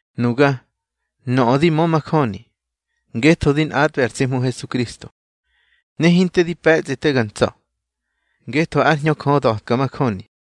Nuga, nöꞌö di mö majöni, ngetho di nꞌatꞌbe ar tsi Hmu Hesukristo. Ne hinte di pe̱tsꞌi te ga ntsa̱, ngetho ár Hñö Jö da̱tka majöni.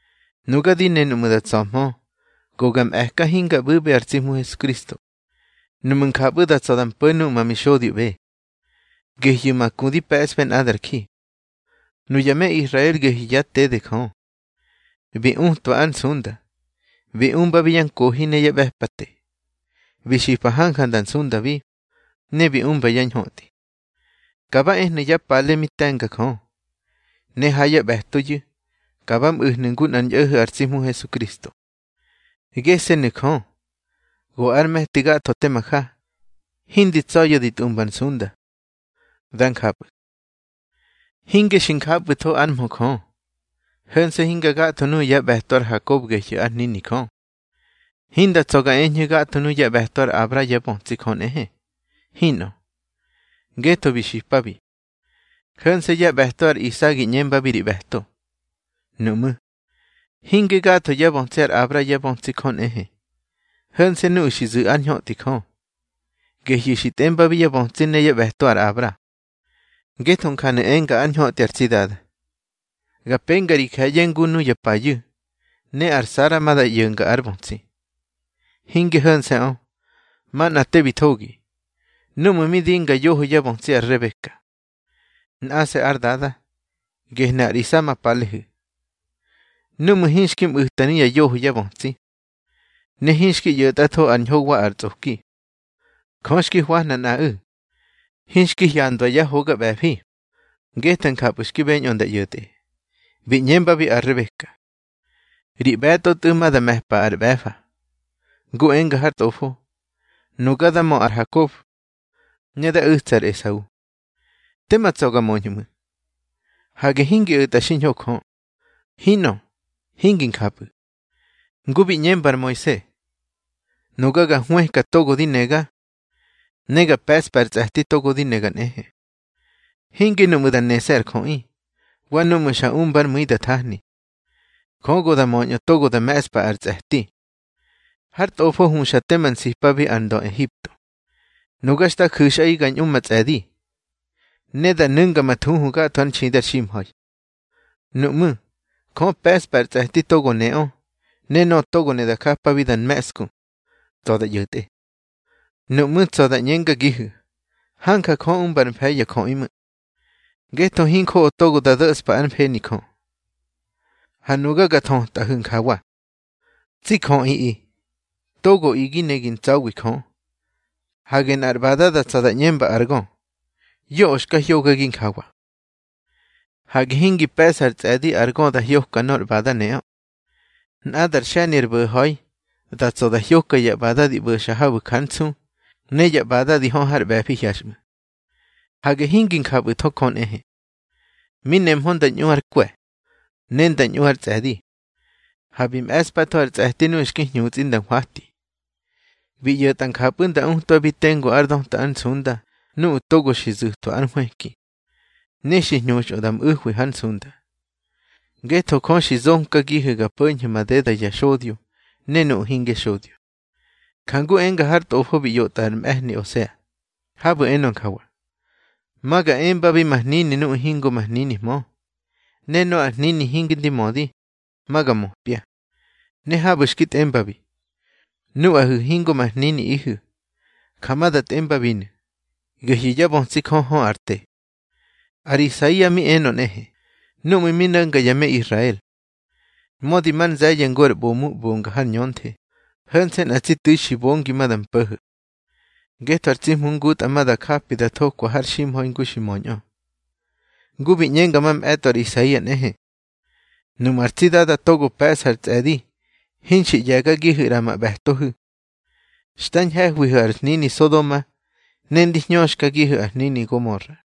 Nuga di ne nuꞌmu̱ da tsa̱hmö, go ga mꞌe̱ka, hinga ꞌbu̱ꞌbe ar tsi Hmu Hesukristo, nuꞌmu̱ njapꞌu̱ da tsa̱ da mpo̱ nuꞌu̱ ma mixodyoꞌbe. Gehyu̱ ma ku di pe̱sꞌbe nꞌadar ji. Nuya me Israel gehyu̱ yá tede Jö, bi utwa ár nsunda. Bi umbabi ya nkohi ne ya ꞌbe̱pate. Bi xipa hanja nda nsundabi, ne bi umba yá ñhötꞌi. Ka ba ehnu̱ yá pale mi te̱nga Jö, ne ha yá ꞌbe̱toyu̱, ka ba mꞌu̱hnu̱ ngu nꞌar ñꞌo̱ho̱ ar tsi Hmu Hesukristo. Gese̱nu̱ Jö, go ár me̱ti gatho tema ja, hindi tsa̱ya̱ di tꞌumba ar nsunda. Dá njapꞌu̱. Hinge xi njapꞌu̱tho ár mhö Jö. Ho̱nse̱ hinga gatho nuꞌu̱ yá ꞌbe̱to ar Hakob gehyu̱ ár hnini Jö. Hinda tsa̱ ga eñhu̱ gatho nuꞌu̱ yá ꞌbe̱to ar Abra yá bötsi Jö nꞌehe. Hinꞌö, ngetho bi xipabi: Ho̱nse̱ yá ꞌbe̱to ar Isa gi ꞌñembabi ri ꞌbe̱to. Nuꞌmú̱, hinge gatho yá bötsi ar Abra yá bötsi Jö nꞌehe. Ho̱nse̱ nuꞌu̱ xi zu̱ ár ñhötꞌi Jö, gehyu̱ xi tꞌembabi yá bötsi ne yá ꞌbe̱to ar Abra. Ngetho njanu̱ enga ár ñhötꞌi ar tsi Dada: Ga penga ri je̱ye̱ ngu nuya payu̱, ne ar Sara ma da ꞌyo̱nga ár bötsi. Hinge ho̱nse̱ꞌö, manꞌa te bi thogi. Númꞌu̱ mi dinga yoho yá bötsi ar Rebeka, nꞌase̱ ár dada, gehnu̱ ar Isa ma palehu̱. Númꞌu̱ hinxki mꞌu̱ta nuya yoho yá bötsi, ne hinxki ꞌyo̱tꞌatho ar ñho wa ar tsꞌoki, Jö xki hwahna nꞌaꞌu̱. Hinxki hyandwa yá hoga ꞌbe̱fi, ngetho njapꞌu̱ xki beñꞌö nda ꞌyo̱tꞌe. Bi ꞌñembabi ar Rebeka: Ri ꞌbe̱tꞌo tꞌu̱ ma da me̱pa ar ꞌbe̱fa. Ngu enga har Tꞌofo: Nuga da mö ar Hakob, ne da u̱tsa ar Esau. Tema tsa̱ ga möñhu̱ ꞌmu̱. Hage hingi o̱tꞌa xiñho Jö. Hinꞌö, hingi njapꞌu̱. Ngu bi ꞌñemba ar Moise: Nuga ga hwëka togo di nega, ne ga pe̱ꞌspa ar tsꞌe̱ti togo di nega nꞌehe. Hinge nuꞌmu̱ da nese̱ ar jöꞌi, wa núꞌmu̱ xa umbár mu̱i da thahni. Jö go da möñꞌö togo da me̱ꞌspa ar tsꞌe̱ti. Har Tꞌofo huxa tema nsipabi ar ndö Ehipto: Nuga xta ju̱xꞌaꞌi ga ñꞌu ma tsꞌe̱di, ne da nu̱nga ma thuhu gatho ár nxidi ar ximha̱i. Nuꞌmú̱, Jö pe̱ꞌspa ar tsꞌe̱ti togo neꞌö, ne nöꞌö togo ne da japabi da nme̱ꞌsku, tsa̱ da ꞌyo̱tꞌe. Nuꞌmú̱, da tsa̱ gi ꞌñengagihu̱: Hanja Jö umba ár mfe̱i ya jöꞌi ꞌmu̱. Ngetho hinjoꞌo togo da do̱spa ár mfeni Jö. Ha nuga ga thötꞌahu̱ njawa: Tsi jöꞌiꞌi, togoꞌi gi ne gi ntsa̱wi Jö. Hage nꞌar ꞌbada tsa̱ da ꞌñemba ar gö, yoꞌö xka hyogagi njawa. Hage hingi pe̱ꞌsa ár tsꞌe̱di ar gö da hyoka nor ꞌbada neꞌö. Nꞌadar xe̱ni ar bo̱ha̱i, da tsa̱ da hyoka ya ꞌbada di ꞌbo̱xa habu̱ jar nsu, ne ya ꞌbada di hö har ꞌbe̱fi hyaxꞌmu̱. Hage hingi njapꞌu̱tho Jö nꞌehe. Mi nemhö nda ñꞌu ár kwe̱, ne nda ñꞌu ár tsꞌe̱di, ha bi me̱ꞌspatho ar tsꞌe̱ti nuꞌu̱ xki hñutsꞌi nda hwati. Bi ꞌyo̱tꞌa njapꞌu̱ nda utwabi tengu ár döta ár nsunda nuꞌu̱ togo xi zu̱twa ár nhwëki, ne xi hñuxꞌö da mꞌu̱hwi hár nsunda. Ngetho Jö xi zonkagihu̱ ga po̱ñhu̱ madeda ya xodyo ne nuꞌu̱ hingya xodyo. Jangu enga har tꞌofo bi ꞌyotꞌa ar mꞌe̱hni Osea, habu̱ enö njawa: Ma ga embabi ma hnini nuꞌu̱ hingo ma hninihmö, Ne nöꞌö ar hnini hingi ndi mödi, ma ga möpya. Ne habu̱ xki tꞌembabi: Nuꞌahu̱ hingo ma hniniꞌihu̱, ja ma da tꞌembabinu̱, gehyu̱ yá bötsi Jö hö ar te. Ar Isaia mi enö nꞌehe, núꞌmu̱ mi no̱nga ya me Israel: Mödi mar nze̱ye̱ ngu ar ꞌbomu ꞌbonga har ñönthe, ho̱nse̱ nꞌa tsi tu̱i xi bongi ma da mpo̱ho̱. Ngetho ar tsi Hmu ngutꞌa ma da japi da thokwa har ximha̱i ngu xi möñꞌö. Ngu bi ꞌñenga mamꞌe̱tꞌo ar Isaia nꞌehe: Nuꞌmu̱ ar tsi Dada togo pe̱ꞌsa ar tsꞌe̱di hinxi ꞌye̱gagihu̱ ꞌra ma ꞌbe̱tohu̱, xta ñhe̱hwihu̱ ar hnini Sodoma, ne ndi hñöxkagihu̱ ar hnini Gomora.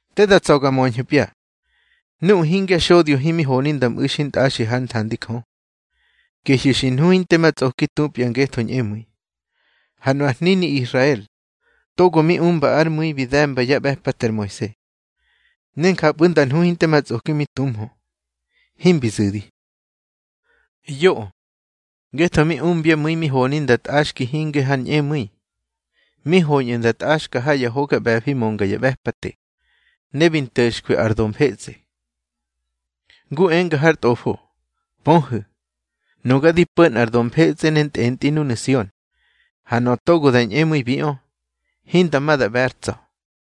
Te da tsa̱ ga möñhu̱pya. Nuꞌu̱ hingya xodyo himi honi nda mꞌu̱ xintꞌaxi hár nthandi Jö, gehyu̱ xi nhu hinte ma tsꞌoki tupya ngetho ñꞌemu̱i. Ha nu ar hnini Israel togo mi umba ár mu̱i bi de̱mba yá ꞌbe̱pate ar Moise, ne njapꞌu̱ nda nhu hinte ma tsꞌoki mi tuhmö, himbi zu̱di. Yoꞌö. Ngetho mi umbyá mu̱i mi honi nda tꞌaxki hinge har ñꞌemu̱i. Mi hoñꞌu̱ nda tꞌaxka ha ya hoga ꞌbe̱fi mönga ya ꞌbe̱pate, ne bi nto̱xkwi ar do mfetsꞌe. Ngu enga har Tꞌofo: Pöhu̱, nuga di po̱ nꞌar do mfetsꞌe ne ntꞌentꞌi núnu̱ Sion. Ha nöꞌö togo da ñꞌemu̱ibiꞌö, hinda ma da ꞌbe̱ ár tsa̱.